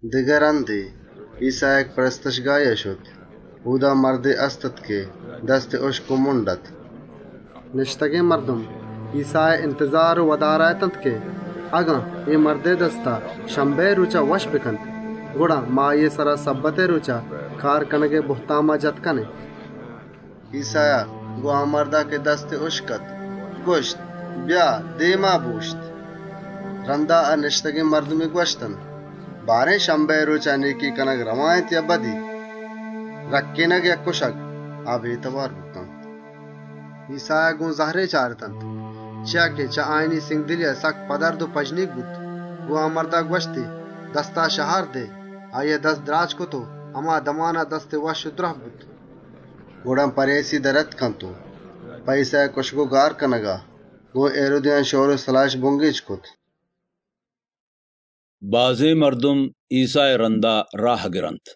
‏ دگه رَندے، ایسّا کنیسها شت. اۆدا مردے هست‌اَت که دستی هُشک و مُنڈ اَت. ‏ نِشتگێن مردم ایسّائے اِنتزار و وَدارا اتنت که: «اگن اے مردئے دستا شَمبِهئے رۆچا دْراه بکنت، گڑا ما آییئے سرا شَبَّتئے رۆچا کار کنگئے بُهتاما جتَ کنێن.» ‏ ایسّایا گۆن مُنڈێن مردا گوَشت: «بیا دێما بۆشت.» ‏ رَندا گۆن آ نِشتگێن مردمان گوَشتی: «بارێن، شَبَّتئے رۆچا، نێکی کنگ رئوا اِنت یا بدی؟ انسانئے زِندئے رَکّێنگ یا کُشگ و گار کنگ؟» آ بێتئوار بوتنت. ‏ ایسّایا گۆن زَهرے چارتنت، چیا که چه آیانی سِنگدلیا سکّ پَدَرْد بوت. گۆن آ مردا گوَشتی: «دستا شهار دئے!» آییا دست شهار دات و دستی وشّ و دْراه بوت. ‏ گڑا پَریسی ڈنّا شتنت و په ایسّائے کۆشارێنگا گۆن هیرودیان شئور و سَلاهِش بُنگێج کرت. بازێن مردمے ایسّائے رَندا راهَ گیپت ‏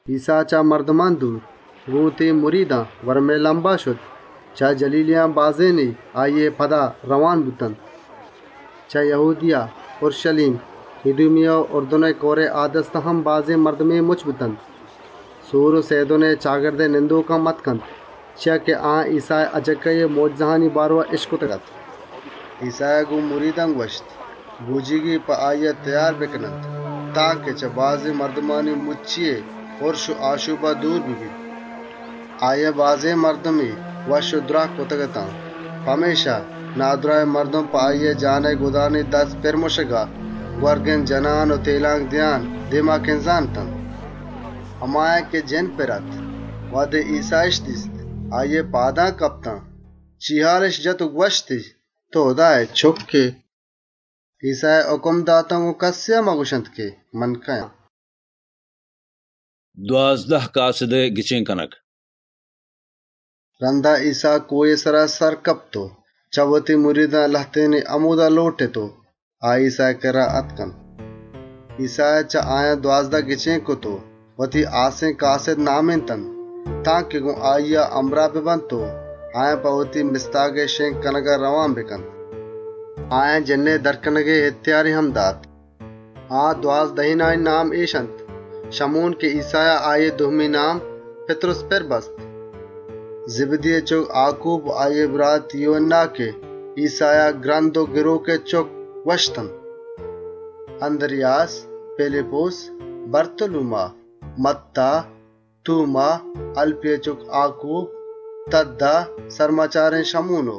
ایسّا چه مردمان دور، گۆن وتی مریدان گوَرمئے لَمبا شت. بازێن جَلیلی مردمے آییئے پدا رئوان بوت. ‏ چه یَهودیَه، اورْشَلیم، اِدومیَه و اُرْدُنئے کئورئے آ دستا هم بازێن مردمے مُچّ بوت، سور و سئیدونئے چپّ و چاگردئے نندۆک هم آتکنت. چیا که آیان ایسّائے مۆجزهانی بارئوا اِشکتگ‌اَت. ‏ ایسّایا گۆن مریدان گوَشت، بۆجیگے په آییا تئیار بکننت تانکه چه بازێن مردمانی مُچّیئے اَنگِرّ و آشۆپا دور ببیت. ‏ آییا بازێن مردمے وشّ و دْراه کرتگ‌اَت، پمێشکا نادْراهێن مردم په آییئے دست پِر کنگا، تێلانک دئیان، دێما کِنزان اتنت. ‏ همایان که جِنّ پِر اَت، وهدے ایسّااِش دیست آییئے پادان کپتنت، کوکّارِش کرت و گوَشتِش: «تئو هُدائے چُکّ ائے.» ‏ ایسّایا هُکم داتنت: «گۆن کَسّا مگوَشێت من کئے آن.» دوازده هاسێن کاسِدئے گچێن کنگ ‏ رَندا، ایسّا کۆهئے سرا سر کپت و چه وتی مریدان لهتێنی همۆدا لۆٹت و آ ایسّائے کِرّا آتکنت. ‏ ایسّایا چه آیان دوازده کَس گچێن کرت و وتی هاسێن کاسِد نامێنتنت، تانکه گۆن آییا همراه ببنت و آیان په وشّێن مستاگئے شِنگ کنگا رئوان بکنت. ‏ جِنّ کَشّگئے اِهتیاری هم داتنت. ‏ آ دوازدهێنانی نام اِش اَنت: شَمون که ایسّایا آییئے دومی نام، «پِتْرُس» پِر بست، ‏ زِبْدیئے چُکّ آکوب و آییئے برات یوهَنّا که ایسّایا «گْرند و گرۆکئے چُکّ» نام پِر بستنت، ‏ اَنْدْریاس، پیلیپُس، بَرتولوما، مَتّا، توما، هَلْپیئے چُکّ آکوب، تَدّا، سَرمچارێن شَمون و ‏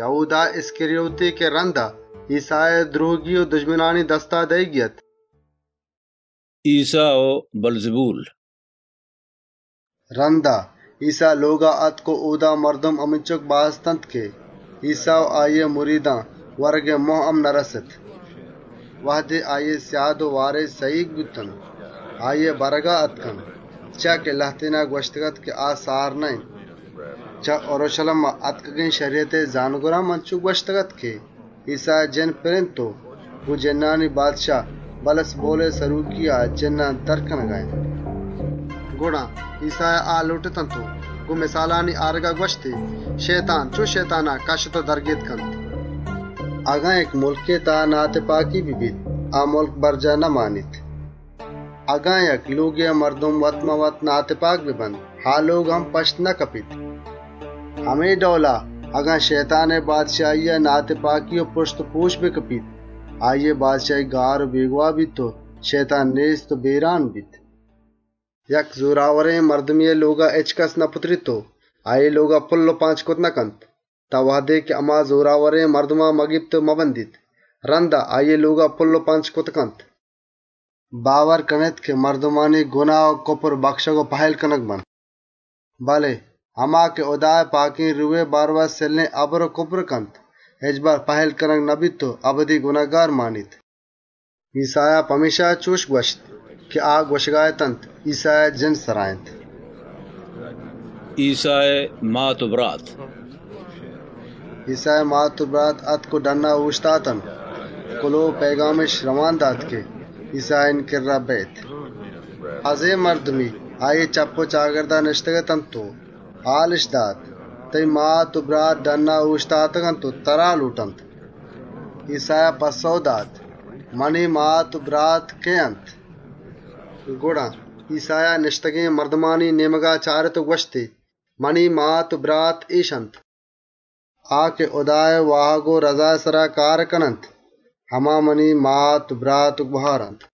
یَهودا اِسْکَریوتی که رَندا ایسّایی دْرۆهگی و دژمنانی دستا دئیگی اَت. ایسّا و بِلزَبول ‏ رَندا، ایسّا لۆگا آتک و اۆدا مردم همینچُک باز اَت که ایسّا و آییئے مریدان ورگئے مۆه هم نرَست. ‏ وهدے آییئے سیاد و وارس سَهیگ بوتنت، آییئے برگا آتکنت، چیا که لهتێنا گوَشتگ‌اَت که آ سار نه‌اِنت. ‏ چه اورْشَلیما آتکگێن شَریَتئے زانۆگران هم انچُش گوَشتگ‌اَت که ایسّایا جِنّ پِر و گۆن جِنّانی سردار بِلزَبولئے سرۆکیا، جِنّانَ کَشّیت. ‏ گڑا ایسّایا آ لۆٹتنت و گۆن مِسالانی آرگا گوَشتی: «شئیتان، چۆن شئیتانا کَشّت و در کرتَ کنت؟ ‏ اگن یک مُلکێا ناتِپاکی ببیت، آ مُلک برجاهَ نمانیت، ‏ اگن یک لۆگێئے مردم وت‌مان‌وت ناتِپاک ببنت، آ لۆگ هم پَشتَ نکپیت. ‏ همے ڈئولا، اگن شئیتانئے بادشاهیا ناتِپاکی و پرُشت و پرۆش بکپیت، آییئے بادشاهی گار و بێگواهَ بیت و شئیتان گار و بێگواهَ بیت. ‏ یک زۆراورێن مردمێئے لۆگا هچکَسَ نپُتریت و آییئے لۆگا پُل و پانچ کرتَ نکنت، تان وهدے که هما زۆراورێن مردما مگیپت و مبندیت. رَندا آییئے لۆگا پُل و پانچ کرتَ کنت. ‏ باور کنێت که مردمانی گناه و کُپر بَکشگ و پهِلّ کنگَ بنت، ‏ بله هما که هُدائے پاکێن روهئے هِلاپا گناه و کُپرَ کنت، هچبر پهِلّ کنگَ نبیت و اَبدی گنهکارَ مانیت.» ‏ ایسّایا پمێشکا چُش گوَشت که آ گوَشگا اتنت، ایسّایا جِنّ سرا اِنت. ایسّائے مات و برات ‏ ایسّائے مات و برات آتک و ڈنّا اۆشتاتنت، کُلئو و پئیگامِش رئوان دات که ایسّا آیانی کِرّا بیئیت. ‏ بازێن مردمے آییئے چپّ و چاگردا نِشتگ‌اَت و هالِش دات: «تئیی مات و برات ڈنّا اۆشتاتگ و ترا لۆٹنت.» ‏ ایسّایا آیانی پَسّئوا جُست کرت: «منی مات و برات کئے اَنت؟» ‏ گڑا، ایسّایا نِشتگێن مردمانی نێمگا چارت و گوَشتی: «منی مات و برات اِش اَنت! ‏ آ که هُدائے واهگ و رَزائے سرا کارَ کننت، هما منی مات و برات و گهار اَنت.»